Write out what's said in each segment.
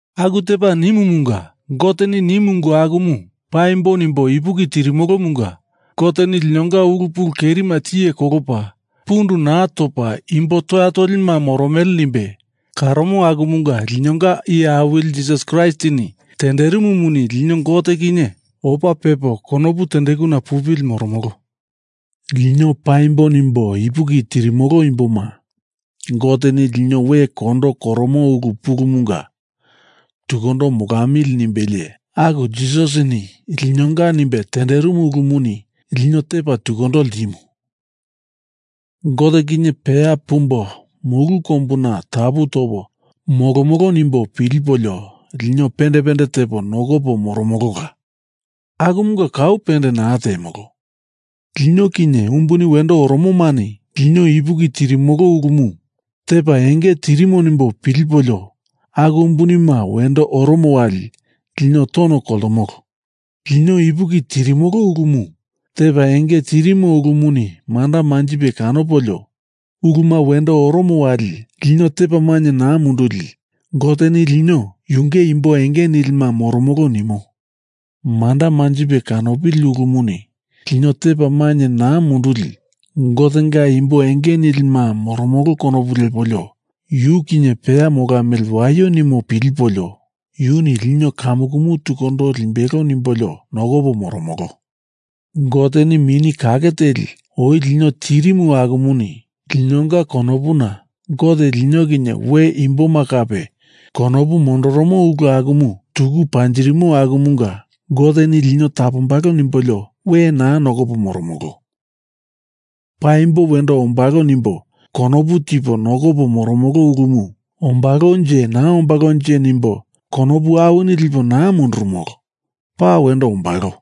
Aku tepa nimumunga, Goteni nimu ungu akumu paimbo nimbo ipuki tirimolomunga Goteni linonga ulu pulu kerima tiye kolopa pundu naa topa imbo toya tolima moromele nimbe karomo akumunga linonga Iye Awili Jisas Kraistini tenderimumuni lino Gote kinye opa pepo konopu tendekuna pupili moromolo. Lino paimbo nimbo ipuki tirimolo imboma, Goteni lino we kondo koromo ulu pulumunga tukundo molamili nimbelie aku Jisasini linonga nimbe tenderimu ulumuni lino tepa tukundo ltimu. Gote kinye peya pumbo mulu kombuna tapu topo molomolo nimbo pilipolio lino pende pende tepo nokopo moromolola. Akumunga kau pende naa temolo. Lino kinye umbuni wendo oromomani lino ipuki tirimolo ulumu tepa enge tirimo nimbo pilipolio aku umbunima wendo oromo wali lino tono koltomolo. Lino ipuki tirimolo ulumu tepa enge tirimo ulumuni manda manjipe kanopolio uluma wendo oromo wali lino tepa mainye naa munduli Goteni lino yunge imbo enge nilima moromolo nimo. Manda manjipe kanopili ulumuni lino tepa mainye naa munduli Gotenga imbo enge nilima moromolo konopu lepolio yu kinye peya molamili waio nimo pilipolio yuni lino kamukumu tukundo limbelo nimbolio nokopo moromolo. Goteni Mini Kake Teli oi lino tirimu akumuni linonga konopuna Gote lino kinye we imboma kape konopu mondoromo ulu akumu tuku panjirimu akumunga Goteni lino tapombalo nimbolio we naa nokopo moromolo. Paimbo wendo ombalo nimbo konopu tipo nokopo moromolo ulumu ombalonje naa ombalonje nimbo konopu awini lipo naa mundurumolo. Paa wendo ombalo.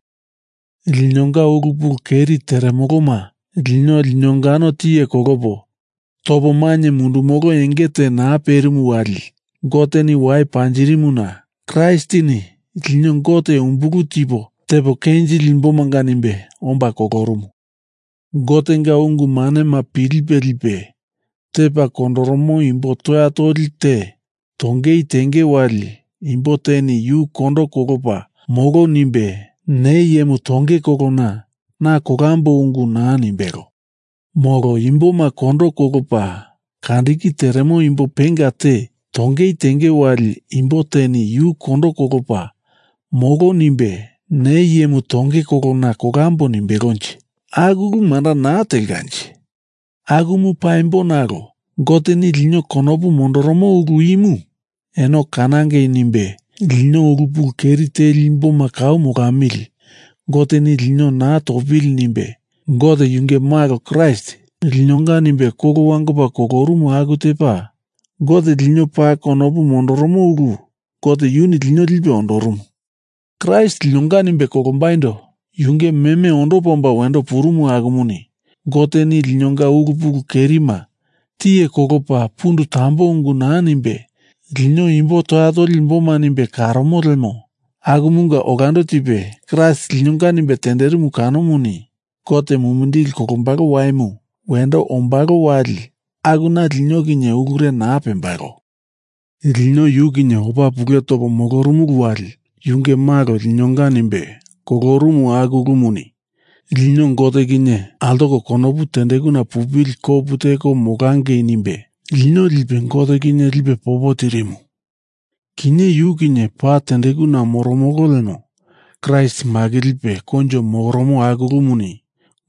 Linonga ulu pulu keri teremoloma lino linongano tiye kolopo topo mainye mundumolo enge te naa perimu wali Goteni wai panjirimuna Kraistini lino Gote umbulu tipo tepo kenjili imbomanga nimbe omba kolorumu. Gotenga ungu manema pilipe lipe tepa kondoromo imbo toya toli te tongei tenge wali imbo teni yu kondo kolopa molo nimbe, ne iyemu tongei kolona na kolamboi ungu naa nimbelo. Molo imboma kondo kolopa kandiki teremo imbo penga te tongei tenge wali imbo teni yu kondo kolopa molo nimbe, ne iyemu tongei kolona kolamboi nimbelonje. Aku ulu manda naa telkanje. Akumu paimbo nalo Goteni lino konopu mondoro ulu imu eno kanangei nimbe lino ulu pulu keri teli imboma kau molamili Goteni lino naa topili nimbe Gote yunge Malo Kraist linonga nimbe kolo wangopa kolorumu aku tepa Gote lino paa konopu mondoromo ulu Gote yuni lino lipe ondorumu. Kraist linonga nimbe kolombaindo yunge meme ondopa omba wendo purumu akumuni Goteni linonga ulu pulu kerima tiye kolopa pundu tambo ungu naa nimbe lino imbo toya toli imboma nimbe karomo lemo akumunga olando tipe Kraist linonga nimbe tenderimu kanomuni Gote mumindili kolombalo waimu wendo ombalo wali akuna lino kinye ulure naa pembalo. Lino yu kinye opa pule topo molorumulu wali yunge Malo linonga nimbe kolorumu aku ulumuni lino Gote kinye altoko konopu tendekuna pupili kopu teko molangei nimbe lino lipe Gote kinye lipe popo tirimu. Kinye yu kinye paa tendekuna moromolo lemo Kraist makilipe koinjo moromo aku ulumuni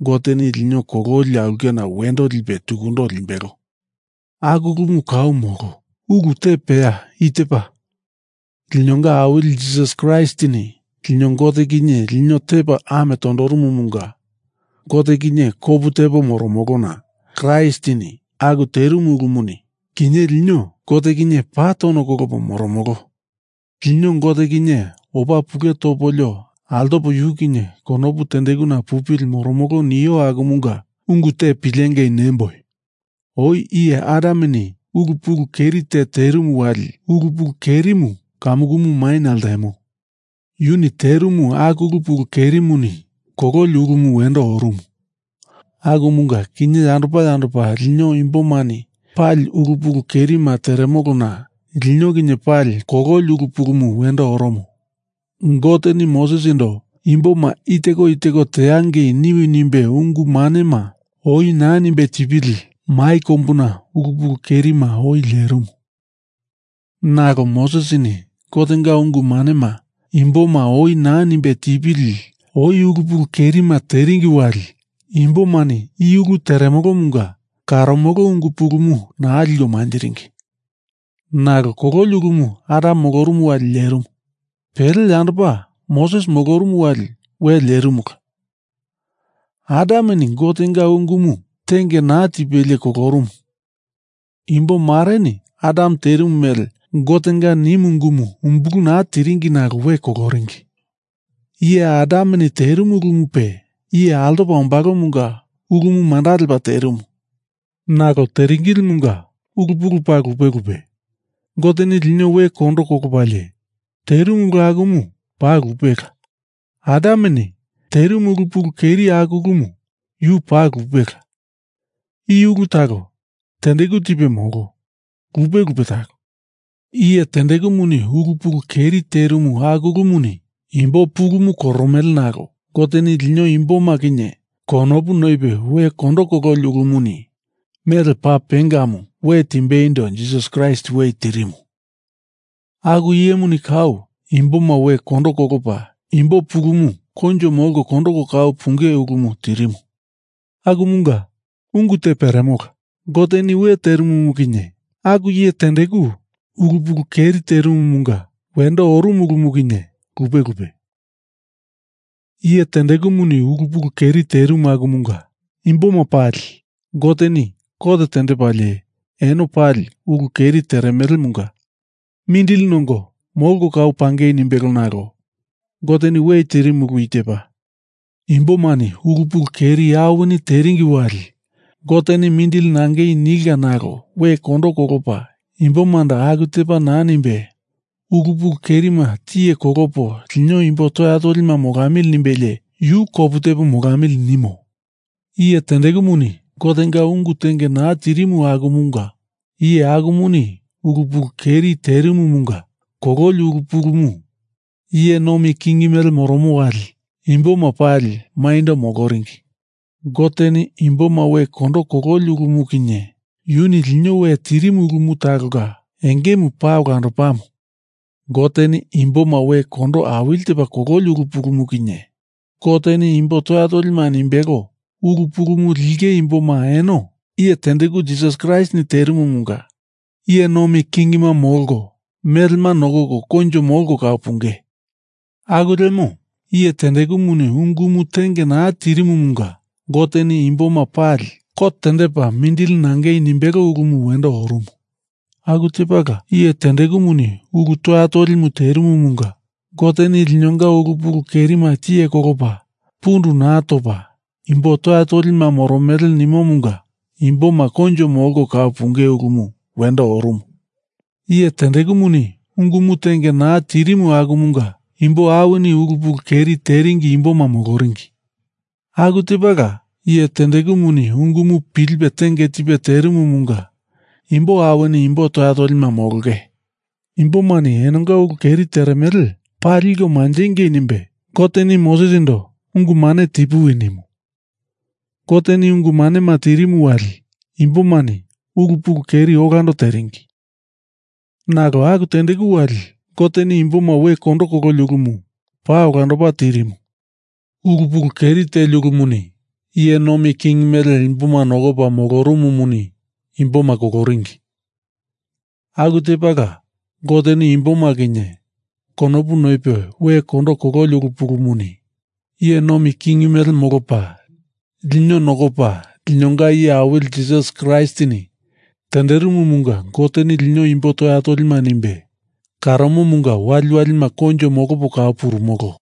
Goteni lino kololi aulkena wendo lipe tukundo limbelo. Aku ulumu kau molo. Ulu te peya i tepa: Linonga Awili Jisas Kraistini lino Gote kinye lino tepa ame tondorumumunga Gote kinye kopu tepo moromolona Kraistini aku terimu ulumuni, kinye lino Gote kinye paa tono kolopo moromolo. Lino Gote kinye opa pule topolio altopo yu kinye konopu tendekuna pupili moromolo nio akumunga ungu te pilengei nemboi. Oi iye Adameni ulu pulu keri te terimu wali ulu pulu kerimu kamukumu maina ltemo. Yuni terimu aku ulu pulu kerimuni kololi ulumu wendo orumu. Akumunga kinye yandopa yandopa lino imbomani pali ulu pulu kerima teremolona lino kinye pali kololi ulu pulumu wendo oromo. Goteni Mosesindo imboma i teko i teko teangei niwi nimbe ungu manema oi naa nimbe tipili mai kombuna ulu pulu kerima oi lerimu. Nalo Mosesini Gotenga ungu manema imboma oi naa nimbe tipili oi ulu pulu kerima teringi wali imbomani i ulu teremolomunga karomolo ungu pulumu naa liko manjiringi. Nalo kololi ulumu Adam molorumu wali lerimu. Pele yandopa Moses molorumu wali we lerimula. Adameni Gotenga ungumu tenge naa tipelie kolorumu. Imbo mareni Adam terimu mele Gotenga nimu ungumu umbulu naa tiringi nalo we koloringi. Iye Adameni terimu ulumupe iye altopa ombalomunga ulumu manda lepa terimu. Nalo teringilimunga ulu pulu paa lupe lupe. Goteni lino we kondo kolopalie terimu ulu akumu paa lupela. Adameni terimu ulu pulu keri aku ulumu yu paa lupela. I ulu talo tendeku tipe molo, lupe lupe talo. Iye tendekumuni ulu pulu keri terimu aku ulumuni imbo pulumu koromele nalo Goteni lino imboma kinye konopu noipe we kondo kololi ulumuni mele paa pengamu we timbeindo Jisas Kraist we tirimu, aku iyemuni kau imboma we kondo kolopa imbo pulumu koinjo molko kondoko kau punge ulumu tirimu. Akumunga ungu te peremola. Goteni we tirimumu kinye, aku iye tendeku ulu pulu keri terimumunga wendo orumu ulumu kinye, lupe lupe. Iye tendekumuni ulu pulu keri terimu akumunga imboma pali Goteni kot tendepalie eno pali ulu keri teremelemunga mindili nongo molko kau pangei nimbelo nalo Goteni we tirimu ulu i tepa: Imbomani ulu pulu keri awini teringi wali Goteni mindili nangei nilka nalo we kondo kolopa imbomando aku tepa naa nimbe ulu pulu kerima tiye kolopo lino imbo toya tolima molamili nimbelie yu kopu tepo molamili nimo. Iye tendekumuni Gotenga ungu tenge naa tirimu akumunga iye akumuni ulu pulu keri terimumunga kololi ulu pulumu iye nomi king mele moromo wali imboma pali maindo moloringi. Goteni imboma we kondo kololi ulumu kinye yuni lino we tirimu ulumu talonga engemu paa olandopamu. Goteni imboma we kondo awili tepa kololi ulu pulumu kinye Goteni imbo toya tolima nimbelo ulu pulumu linge imboma eno iye tendeku Jisas Kraistini terimumunga iye nomi kingima molko melema nokoko koinjo molko kau punge. Aku lemo, iye tendekumuni ungumu tenge naa tirimumunga Goteni imboma pali kot tendepa mindili nangei nimbelo ulumu wendo orumu, aku tepala iye tendekumuni ulu toya tolimu terimumunga Goteni linonga ulu pulu kerima tiye kolopa pundu naa topa imbo toya tolima moromele nimomunga imboma koinjo molko kau punge ulumu wendo orumu. Iye tendekumuni ungumu tenge naa tirimu akumunga imbo awinini ulu pulu keri teringi imboma moloringi. Aku tepala iye tendekumuni ungumu pilipe tenge tipe terimumunga imbo awini imbo toya tolima molonge. Imbomani enonga ulu keri teremele paa liko manjingei nimbe Goteni Mosesindo ungu mane tipuwi nimu. Goteni ungu manema tirimu wali imbomani ulu pulu keri olando teringi. Nalo aku tendeku wali Goteni imboma we kondo kololi ulumu paa olandopa terimu. Ulu pulu keri teli ulumuni iye nomi king mele imboma nokopa molorumumuni imboma koloringi. Aku tepala Goteni imboma kinye konopu noipe we kondo kololi ulu pulumuni iye nomi king mele molopa lino nokopa linonga Iye Awili Jisas Kraistini tenderimumunga Goteni lino imbo toya tolima nimbe karomomunga waliwalima koinjo molopo kau purumolo.